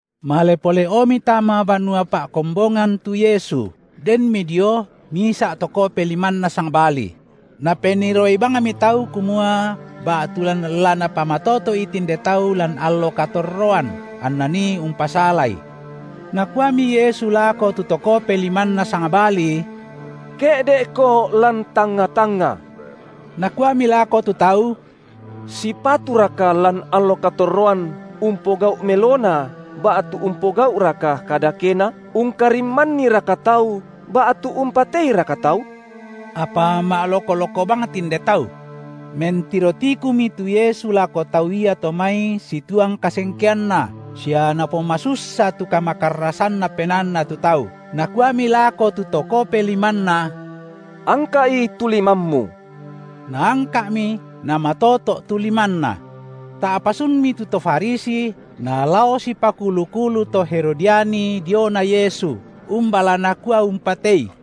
Male pole’omi tama banua pa’kombongan tu Yesu, denmi dio, misa’ to kope limanna sangbali; napenniroi bangmi tau, kumua ba’tu la Napamatoto’i tinde tau lan allo katorroan, anna nii umpasalaI. Nakuami Yesu lako tu to kope limanna sangbali: Ke’de’ko lan tangnga-tangnga. Nakuami lako tu tau: Sipaturaka lan allo katorroan, umpogau’ melona ba’tu umpogau’raka kadakena, ungkarimmanniraka tau ba’tu umpateiraka tau? Apa ma’loko-loko bang tinde tau. Mentiro tikumi tu Yesu lako tau iato mai situang kasengkeanNa sia Napomasussa tu kamakarrasanna penaanna tu tau, Nakuami lako tu to kope limanna: Angka’i tu limammu! Naangka’mi namatoto’ tu limanna. Ta’pa sunmi tu to Farisi nalao sipakulu-kulu to Herodiani diona Yesu, umba la nakua umpatei.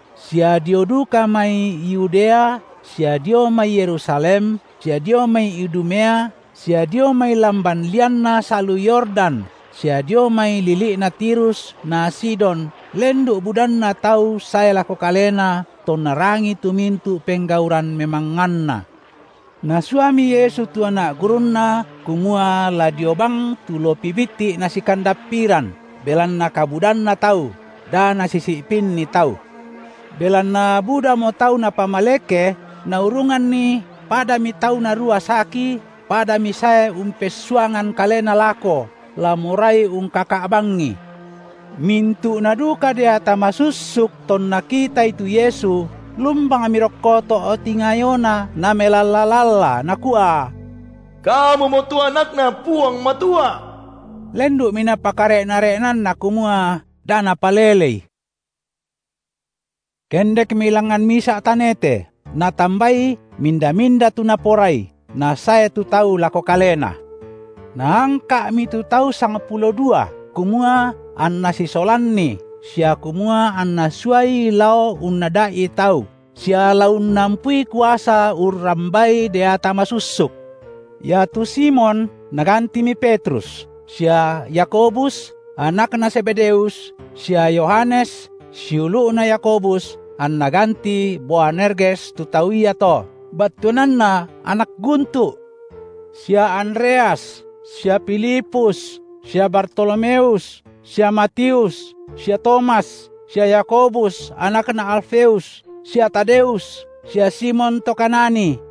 sia dio duka mai Yudea sia dio mai Yerusalem sia dio mai Idumea sia dio mai lamban lianna salu Yordan sia dio mai lili’na Tirus na Sidon lendu’ budanna tau sae lako Kalena, tonna rangii tu mintu’ penggauran memangnganNa. Nasuami Yesu tu anak gurunNa kumua la dio bang tu lopi bitti’ nasikandappiran, belanna kabudanna tau, da nasisi’pinni tau. Belanna budamo tau Napamaleke, naurunganni padami tau narua saki padami sae umpessuangan kalena lako, la morai ungkaka’ bangI. Mintu’na duka deata masussuk, tonna kitaI tu Yesu, lumbangmi rokko to’ tingayoNa namelalla-lalla, nakua: Kamumo tu AnakNa Puang Matua. Lendu’mi Napakare’na-re’nanNa kumua, da napalelei. Kendekmi langngan misa’ tanete, Natambai minda-minda tu Naporai, nasae tu tau lako Kalena. Naangka’mi tu tau sangpulo dua, kumua anNa sisolanni sia kumua anNa suai lao unnada’i tau, sia la unnampui kuasa urrambai deata masussuk. Iatu Simon Nagantimi Petrus, sia Yakobus, anakna Zebedeus sia Yohanes siulu’na Yakobus anNa gantii Boanerges tu tau iato, battuananna anak guntu’. Sia Andreas sia Filipus sia Bartolomeus sia Matius sia Tomas sia Yakobus, anakna Alfeus sia Tadeus sia Simon to Kanani,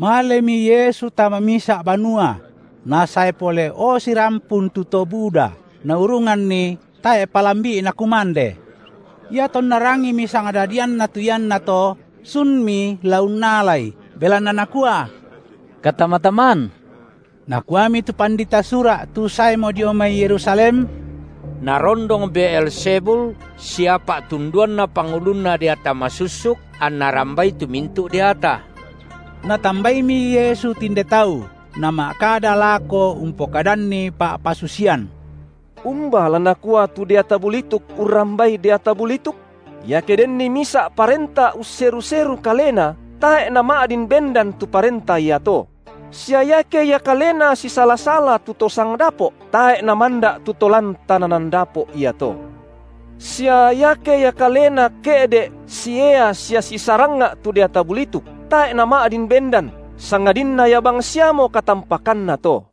Malemi Yesu tama misa’ banua: nasae pole’o sirampun tu to buda, naurunganni tae’ palambi’Na kumande. Iatonna rangimi sangdadianNa tu iannato, sunmi la unnalai, belanna nakua: katama-taman. Nakuami tu pandita Sura’ tu saemo dio mai Yerusalem: Narondong Beelzebul sia pa’tunduanna pangulunna deata masussuk anNa rambai tu mintu’ deata. Natambaimi Yesu tinde tau, Nama’kada lako umpokadanni pa’pasusian: Umba la nakua tu deata bulituk urrambai deata bulituk? Iake denni misa’ parenta usseru-seru kalena, tae’ nama’din bendan tu parenta iato; sia iake ia kalena sisala-sala tu to sangdapo’, tae’ namanda’ tu to lan tananan dapo’ iato. Sia iake ia kalena ke’de’ siea sia sisarangnga’ tu deata bulituk, tae’ nama’din bendan, sangadinna ia bangsiamo katampakanna to.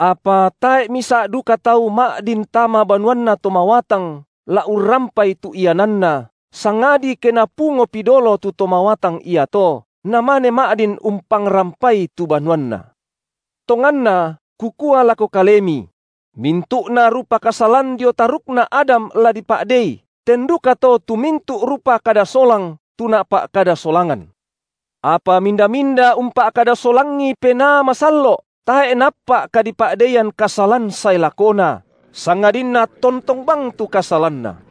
Apa tae’ misa’ duka tau ma’din tama banuanna to mawatang la urrampai tu iananna, sangadi ke napungopi dolo tu to mawatang iato, namane ma’din umpangrampai tu banuanna. Tonganna, Kukua lako kalemi: mintu’na rupa kasalan dio tarukna Adam la dipa’dei, ten dukato tu mintu’ rupa kada solang tu napa’kada solangan. Apa minda-minda umpa’kada solangi Penaa Masallo’ tae’ naappa’ kadipa’deian kasalan sae lakona, sangadinna tontong bang tu kasalanna.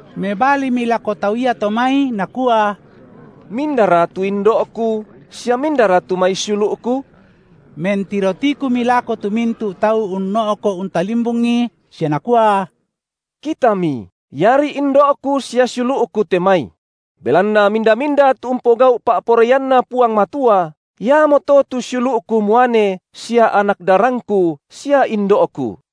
Mebalimi lako tau iato mai, Nakua: Mindara tu indo’Ku, sia mindara tu mai siulu’Ku? Mentiro tikumi lako tu mintu’ tau unno’ko’ untalimbungi sia Nakua: Kitami, iari indo’Ku sia siulu’Ku te mai! Belanna minda-minda tu umpogau’ pa’poraianNa Puang Matua iamoto tu siulu’Ku muane sia anak darangKu sia indo’Ku.